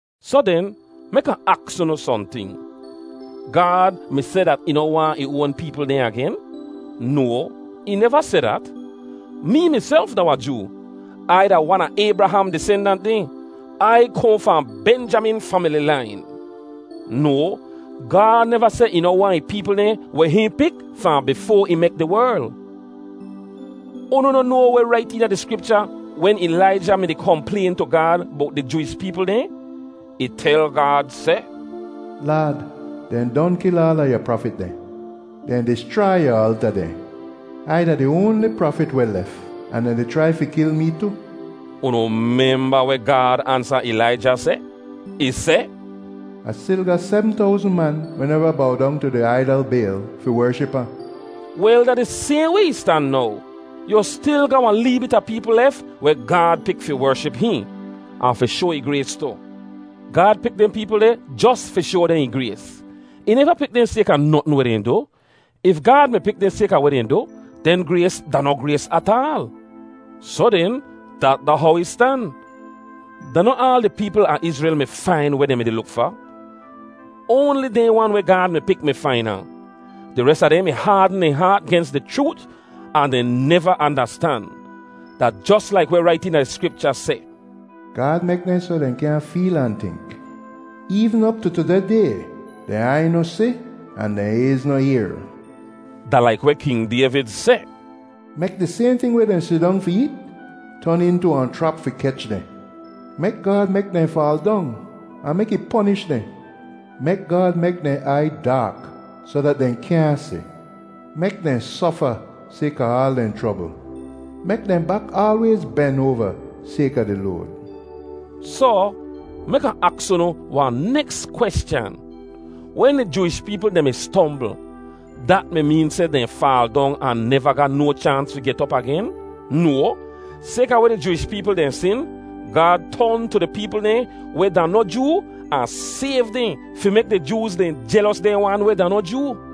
Soh den, mek Ah aks unu sohnting: Gaad mi seh dat ih noh waahn ih oan peepl dehn agen? No, ih neva seh dat! Mee miself da wahn Joo. Ai da wan a Aybraham disendant dehn; Ai kohn fahn Benjamin famili lain. No, Gaad neva seh ih noh waahn ih peepl dehn weh hihn pik fahn bifoa ih mek di werl. Unu noh noa weh rait eena di Skripcha wen Ilaija mi-di komplayn tu Gaad bowt di Jooish peepl dehn? Ih tel Gaad seh, “Laad, dehn don kil aala yu prafit dehn. Dehn dischrai yu alta dehn. Ai da di oanli prafit weh lef, ahn dehn di chrai fi kil mee tu.” Unu memba weh Gaad ansa Ilaija seh? Ih seh, “Ah stil ga sebm towzn man weh neva bow dong tu di aidal Bayl fi wership ahn.” Wel, da di sayhn way ih stan now. Yu stil ga wahn lee bit a peepl lef weh Gaad pik fi wership hihn, ahn fi shoa ih grays tu. Gaad pik dehn peepl deh jos fi shoa dehn ih grays. Ih neva pik dehn sayka notn weh dehn du. If Gaad mi pik dehn sayka weh dehn du, den grays da noh grays ataal. Soh den, dat da how ih stan. Da noh aal di peepl a Izrel mi fain weh dehn mi-di luk fa. Oanli dehn wan weh Gaad mi pik mi fain ahn. Di res a dehn mi haadn dehn haat gens di chroot ahn dehn neva andastan. Da jos laik weh rait eena di Skripcha seh, “Gaad mek dehn soh dehn kyaahn feel ahn tink. Eevn op tu tudeh day, dehn aiy noh si ahn dehn ayz noh yehr.” Da laik weh King Dayvid seh, “Mek di sayhn ting weh dehn sidong fi eet ton intu wahn chrap fi kech dehn. Mek Gaad mek dehn faal dong, ahn mek ih ponish dehn. Mek Gaad mek dehn aiy daak soh dat dehn kyaahn si. Mek dehn sofa sayka aal dehn chrobl; mek dehn bak aalwayz ben oava sayka di load.” Soh, mek Ah aks unu wahn neks kweschan: Wen di Jooish peepl dehn mi stombl, dat mi meen seh dehn faal dong ahn neva ga no chaans fi get op agen? No! Sayka weh di Jooish peepl dehn sin, Gaad ton tu di peepl dehn weh da noh Joo ahn sayv dehn fi mek di Jooz dehn jelos dehn wan weh da noh Joo.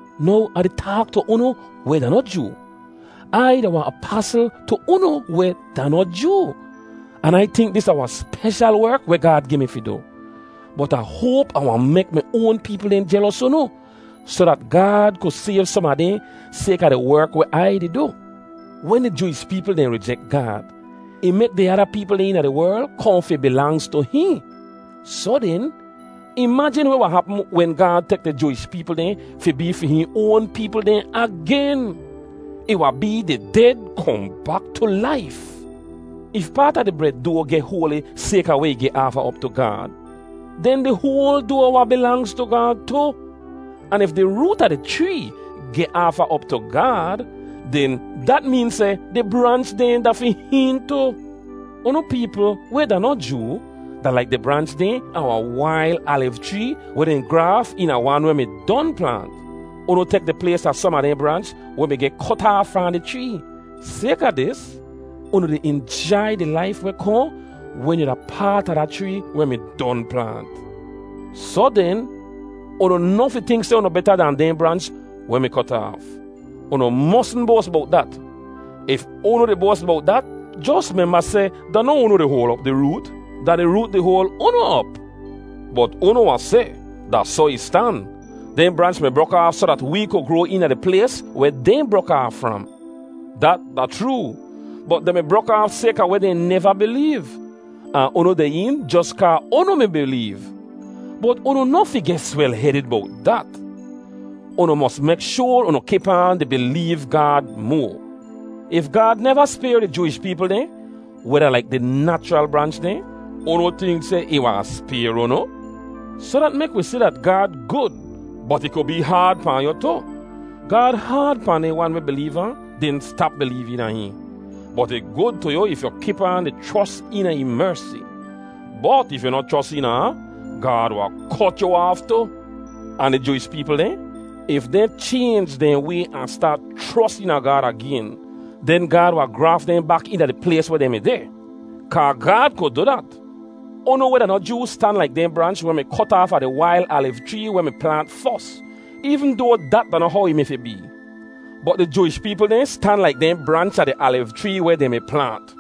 Now Ah di taak tu unu weh da noh Joo. Ai da wahn apasl tu unu weh da noh Joo, an Ai tink dat dis da wahn speshal werk weh Gaad gi mi fi du. Bot Ah hoap Ah wahn mek mi oan peepl dehn jelos unu, soh dat Gaad ku sayv som a dehn sayka di werk weh Ai di du. Wen di Jooish peepl dehn rijek Gaad, ih mek di ada peepl dehn eena di werl kohn fi bilangz tu hihn. Soh den, imajin weh wahn hapm wen Gaad tek di Jooish peepl dehn fi bee fi hihn oan peepl dehn agen! Ih wahn bee di ded kohn bak tu laif. If paat a di bred doa geh hoali sayka weh ih geh aafa op tu Gaad, den di hoal doa wahn bilangz tu Gaad tu. Ahn if di root a di chree geh aafa op tu Gaad, den dat meen seh di branch dehn da fi hihn tu. Unu peepl weh da noh Joo da laik di branch dehn a wahn wail aliv chree weh dehn graaf eena wan weh mi don plaant. Unu tek di plays a som a dehn branch weh mi geh kot aaf fahn di chree. Sayka dis, unu di injai di laif weh kohn wen yu da paat a da chree weh mi don plaant. Soh den, unu noh fi tink seh unu beta dan dehn branch weh mi kot aaf. Unu mosn boas bowt dat! If unu di boas bowt dat, jos memba seh da noh unu di hoal op di root; da di root di hoal unu op. Bot unu wahn seh, “Da soh ih stan. Dehn branch mi brok aaf soh dat wee ku groa eena di plays weh dehn brok aaf fram.” Dat da chroo! Bot dehn mi brok aaf sayka weh dehn neva bileev. Ahn unu deh een jos kaa unu mi bileev. Bot unu noh fi geh swel-hedid bowt dat. Unu mos mek shoar unu kip aan di bileev Gaad moa. If Gaad neva spayr di Jooish peepl dehn, weh da laik di nachral branch dehn, unu tink seh ih wahn spayr unu? Soh dat mek wi si dat Gaad gud, bot ih ku bee haad pahn yu tu. Gaad haad pahn dehn wan weh bileev ahn den stap bileev eena hihn. Bot ih gud tu yu if yu kip aan di chros eena ih mersi. Bot if yu noh chros eena ahn, Gaad wahn kot yu aaf tu. Ahn di Jooish peepl dehn, if dehn chaynj dehn way ahn staat chros eena Gaad agen, den Gaad wahn graaf dehn bak eena di plays weh dehn mi deh. Kaa Gaad ku du dat. Unu weh da noh Joo stan laik dehn branch weh mi kot aafa di wail aliv chree weh mi plaant fos, eevn doa dat da noh how ih mi fi bee. Bot di Jooish peepl dehn stan laik dehn branch a di aliv chree weh dehn mi plaant.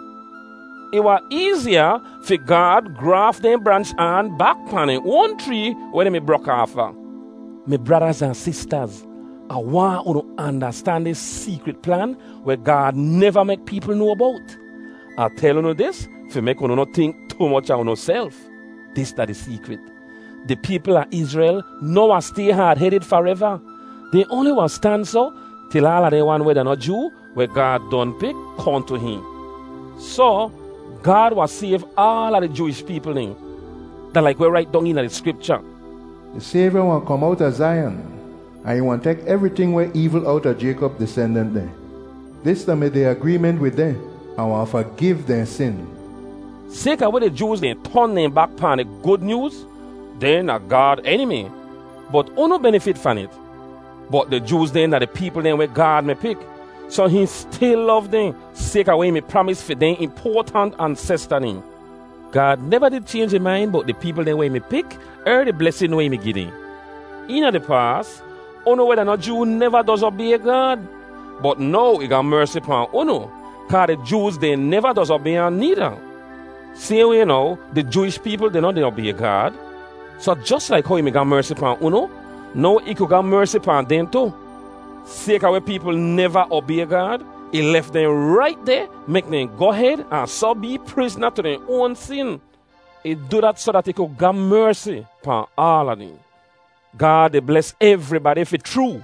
Ih wahn eeziya fi Gaad graaf dehn branch aan bak pahn dehn oan chree weh dehn mi brok aafa. Mi bradaz ahn sistaz, Ah waahn unu andastan dis seekrit plan weh Gaad neva mek peepl noa bowt. Ah tel unu dis fi mek unu noh tink tu moch a unuself. Dis da di seekrit: Di peepl a Izrel noh wahn stay haad-hedid fareva. Dehn oanli wahn stan soh til aala dehn wan weh da noh Joo, weh Gaad don pik, kohn tu hihn. Soh, Gaad wahn sayv aala di Jooish peepl dehn. Da laik weh rait dong eena di Skripcha, “Di Sayvya wahn kom owta Zaiyan, ahn ih wahn tek evriting weh eevl owta Jaykop disendant dehn. Dis da-mi di agreement wid dehn. Ah wahn fagiv dehn sin.” Sayka weh di Jooz dehn ton dehn bak pahn di Gud Nyooz, dehn da Gaad enimi, bot unu benifit fahn it. Bot di Jooz dehn da di peepl dehn weh Gaad mi pik, soh hihn stil lov dehn, sayka weh ih mi pramis fi dehn impoatant ansesta dehn. Gaad neva did chaynj ih main bowt di peepl dehn weh ih mi pik er di blesin weh ih mi gi dehn. Eena di paas, unu weh da noh Joo neva doz obay Gaad. Bot now ih ga mersi pahn unu, kaa di Jooz dehn neva doz obay ahn needa. Sayhn way now, di Jooish peepl dehn noh di obay Gaad, soh jos laik how ih mi ga mersi pahn unu, now ih ku ga mersi pahn dehn tu. Sayka weh peepl neva obay Gaad, ih lef dehn rait deh mek dehn goh hed ahn soh bee prizna tu dehn oan sin. Ih du dat soh dat ih ku ga mersi pahn aala dehn. Gaad di bles evribadi fi chroo!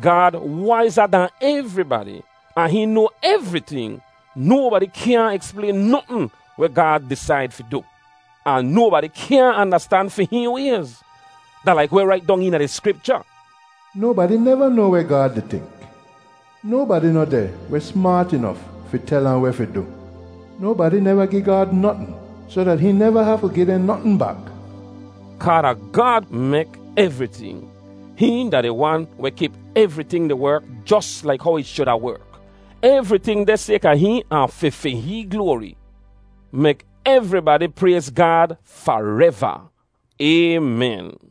Gaad waiza dahn evribadi, ahn hihn noa evriting! Nobadi kyaahn eksplayn notn weh Gaad disaid fi du! Ahn nobadi kyaahn andastan fi hihn wayz! Da laik weh rait dong eena di Skripcha, “Nobadi neva noa weh Gaad di tink! Nobadi noh deh weh smaat inof fi tel ahn weh fi du!” “Nobadi neva gi Gaad notn soh dat hihn neva hafu gi dehn notn bak!” Kaa da Gaad mek evriting. Hihn da di wan weh kip evriting di werk jos laik how ih shuda werk. Evriting deh sayka hihn ahn fi fi hihn gloari. Mek evribadi prayz Gaad fareva! Aymen.